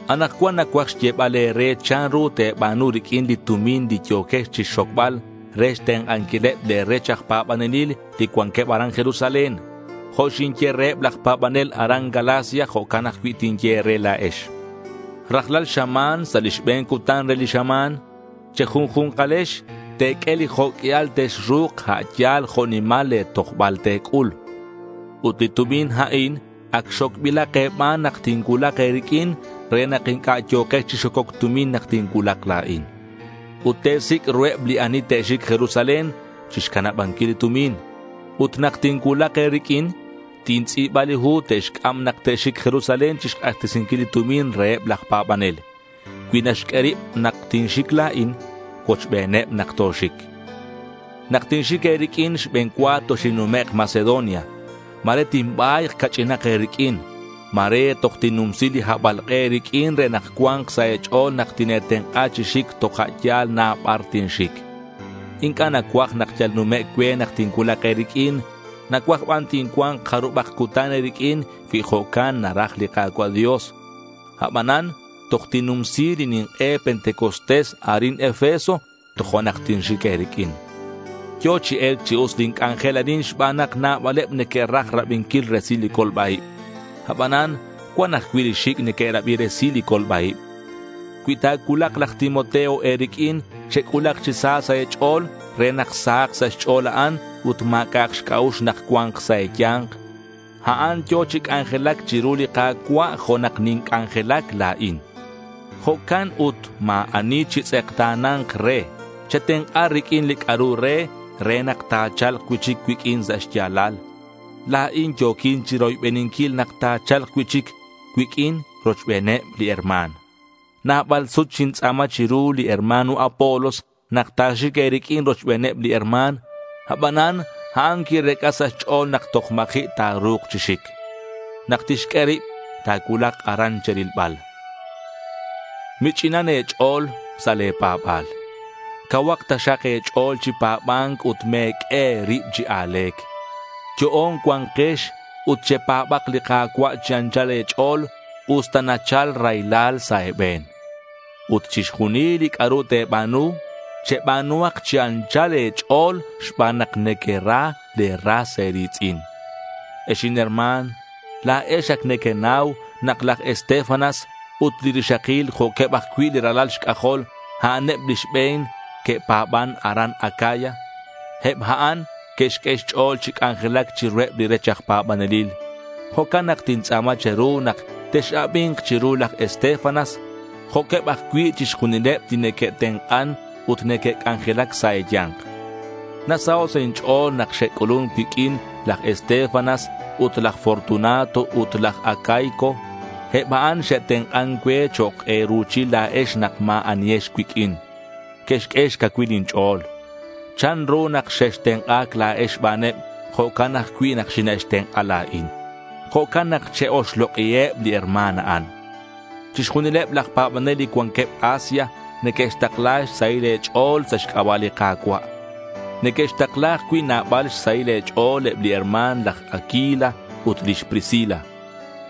Anakcuan nacuaj xyebal e̱re chanru te̱ba̱nu riq'uin li tumin li yo̱quex chixxocbal re xtenk'anquileb le̱ rech aj pa̱banelil li cuanqueb aran Jerusalén. Jo' xinye reheb laj pa̱banel aran Galacia, jo'can ajcui' tinye e̱re la̱ex. Rajlal xama̱n, sa' li xbe̱n cutan re li xama̱n, che̱junju̱nkalex te̱q'ue li jo' q'uial texru̱k a' yal jo' nimal le̱ tojbal te̱c'ul. Ut li tumin a'in ac xocbilak e̱ban nak tincuulak e̱riq'uin re nak inc'a' yo̱kex chi xococ tumin nak tincuulak la̱in. Ut te̱sic' ruheb li ani te'xic Jerusalén chixcanabanquil li tumin. Ut nak tincuulak e̱riq'uin, tintz'i̱ba li hu te'xc'am nak te'xic Jerusalén chixk'axtesinquil li tumin reheb laj pa̱banel. Cui naxq'ue rib nak tinxic la̱in, cuochbeneb nak toxic. Nak tinxic e̱riq'uin, xbe̱n cua toxinnumek' Macedonia. Ma̱re tinba̱yk ca'ch'inak e̱riq'uin. Ma̱re toj tinnumsi li habalk'e e̱riq'uin re nak cua̱nk sa' e̱ch'o̱l nak tine̱tenk'a chi xic toja' yal na bar tinxic. Inc'a' nacuaj nak yal numec' cue nak tincuulak e̱riq'uin. Nacuaj ban tincua̱nk jarubak cutan e̱riq'uin cui jo'can naraj li Ka̱cua' Dios. Abanan toj tinnumsi li nink'e Pentecostés arin Efeso tojo'nak tinxic e̱riq'uin. Yo̱ chi e̱lc chi us lin c'anjel arin xban nak nabaleb neque'raj rabinquil resil li colba-ib. Abanan cuan ajcui' li xic' neque'rabi resil li colba-ib. Cui ta̱cuulak laj Timoteo e̱riq'uin, chec'ulak chi sa sa' e̱ch'o̱l re nak sahak sa' xch'o̱l a'an ut ma̱c'a'ak xc'a'ux nak cua̱nk sa' e̱ya̱nk. A'an yo̱ chi c'anjelac chiru li Ka̱cua' jo' nak ninc'anjelac la̱in. Jo'can ut ma̱ ani chitz'ekta̱na̱nk re. Chetenk'a riq'uin li c'a'ru re, re nak ta̱cha̱lk cui'chic cuiq'uin sa' xya̱lal. La̱in yo̱quin chiroybeninquil nak ta̱cha̱lk cui'chic cuiq'uin rochbeneb li herma̱n. Nabal sut xintz'a̱ma chiru li hermano Apolos nak ta̱xic e̱riq'uin rochbeneb li herma̱n. Abanan a'an quirec'a sa' xch'o̱l nak toj ma̱ji' ta̱ru̱k chi xic. Nak tixq'ue rib ta̱cuulak aran che̱rilbal. Mich'inan e̱ch'o̱l sa' le̱ pa̱ba̱l. Cauhak taxak e̱ch'o̱l chi pa̱ba̱nc ut me̱q'ue e̱rib chi a̱le̱c. Yo'on cua̱nkex ut chepa̱bak li Ka̱cua' chi anchal e̱ch'o̱l, usta nachal raylal sa' e̱be̱n. Ut chixjunil li c'a'ru te̱ba̱nu, cheba̱nuhak chi anchal e̱ch'o̱l xban nak nequera le̱ ras e̱ri̱tz'in. Ex inherma̱n, la̱ex ac nequenau nak laj Estéfanas ut li rixakil jo'queb ajcui' li ralal xc'ajol, a'aneb li xbe̱n que'pa̱ban aran Acaya. Eb a'an que'xq'ue xch'o̱l chi c'anjelac chiruheb li rech aj pa̱banelil. Jo'can nak tintz'a̱ma che̱ru nak tex-abi̱nk chiru laj Estéfanas jo'queb ajcui' chixjunileb li neque'tenk'an ut neque'c'anjelac sa' e̱ya̱nk. Nasaho' sa' inch'o̱l nak xe'c'ulun cuiq'uin laj Estéfanas ut laj Fortunato ut laj Acaico. Eb a'an xe'tenk'an cue chok' e̱ruchil la̱ex nak ma̱ anihex cuiq'uin. Que'xq'ue xcacuil inch'o̱l. Chanru nak xextenk'a̱c la̱ex xbaneb, jo'can ajcui' nak xine'xtenk'a la̱in. Jo'can nak che-oxlok'iheb li herma̱n a'an. Chixjunileb laj pa̱banel li cuanqueb Asia neque'xtakla xsahil e̱ch'o̱l sa' xc'aba' li Ka̱cua'. Neque'xtakla ajcui' nabal xsahil e̱ch'o̱l eb li herma̱n laj Aquila ut lix Priscila.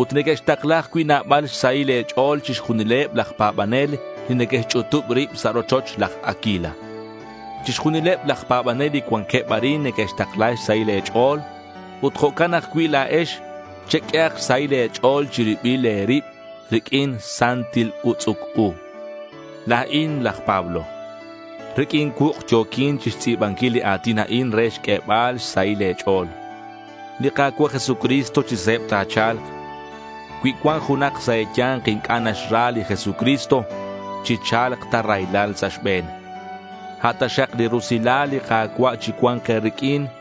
Ut neque'xtakla ajcui' nabal xsahil e̱ch'o̱l chixjunileb laj pa̱banel li neque'xch'utub rib sa' rochoch laj Aquila. Chixjunileb laj pa̱banel li cuanqueb arin neque'xtakla xsahil e̱ch'o̱l. Ut jo'can ajcui' la̱ex, cheq'uehak xsahil e̱ch'o̱l che̱ribil e̱rib riq'uin santil utz'uc u. La̱in laj Pablo. Riq'uin cuuk' yo̱quin chixtz'i̱banquil li a̱tin a'in re xq'uebal xsahil e̱ch'o̱l. Li Ka̱cua' Jesucristo chi se̱b ta̱cha̱lk. Cui cuan junak sa' e̱ya̱nk inc'a' naxra li Jesucristo, chi cha̱lc ta raylal sa' xbe̱n. A' taxak li rusilal li Ka̱cua' chicua̱nk e̱riq'uin.